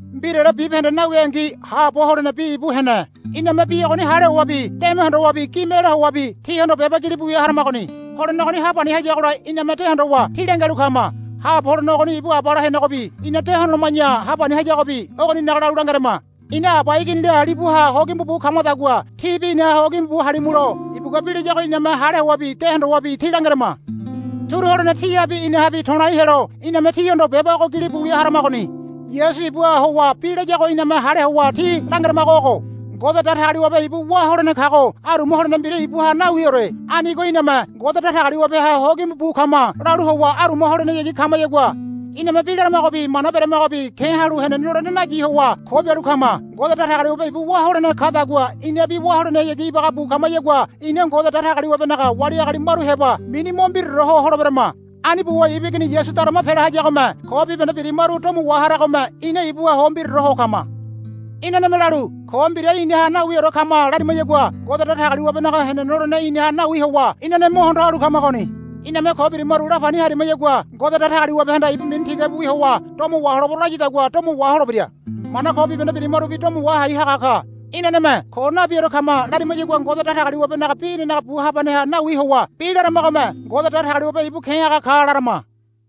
Mbirale bibahende nawingi haabo holene Bi ibu hene. Iname Bi ogoni hale howabi deme hondowabi gime ela howabi tíhondo beba gilibu wia haramagoni. Holene ogoni hapani hayagola iname de hondowa tí langialu kama. Haabo holene ogoni ibu Abala henegobi ina de hondoloma̱ya hapani hayagobi ogoninaga lalu langerama. Ina Aba Iginila libuha ho gimbu bu kamadagua tíbi inaha ho gimbu bu halimulo ibugua bi layago iname hale howabi de hondowabi tí langerama. Turu holene tíhabi inahabi to̱lai helo iname tíhondo beba ogo gilibu wia haramagoni. Yasu ibuha howa bi layago iname hale howa tí langeramago ogo. Ngode Datagaliwabe ibu wá holene kago aruma holene mbira ibuha nawiore. Anigo iname, Ngode Datagaliwabeha hogimbu bu kama, lalu howa aruma holenehayagi kamayagua iname bi laramagobi mana beremagobi ke̱ halu henene lolene nayi howa ko bialu kama. Ngode Datagaliwabe ibu wá holene kadagua inabi wá holenehayagi ibaga bu kamayagua ina Ngode Datagaliwabenaga wali agali maru heba mini mo mbiraore ho holeberama. Ani buwa ibu Igini Yasu darama pela hayagome ko bibahende birimaru domo waharagome ina ibuha ho mbiraore ho kama. Inaneme lalu, Ko mbira inaha nawiore kama, larimayagua Ngode Datagaliwabenaga henene lolene inaha nawi howa inane mo hondo halu kamagoni. Iname ko birimaru lapani harimayagua Ngode Datagaliwabehanda ibu mini tigabi howa domo waholebero layadagua domo waholebira. Mana ko bibahende birimarubi domo wahai haga ka. Inaneme, Ko nabiore kama, larimayagua Ngode Datagaliwabenaga bi inanaga bu habaneha nawi howa bi laramagome, Ngode Datagaliwabe ibu ke̱ haga ka, larama.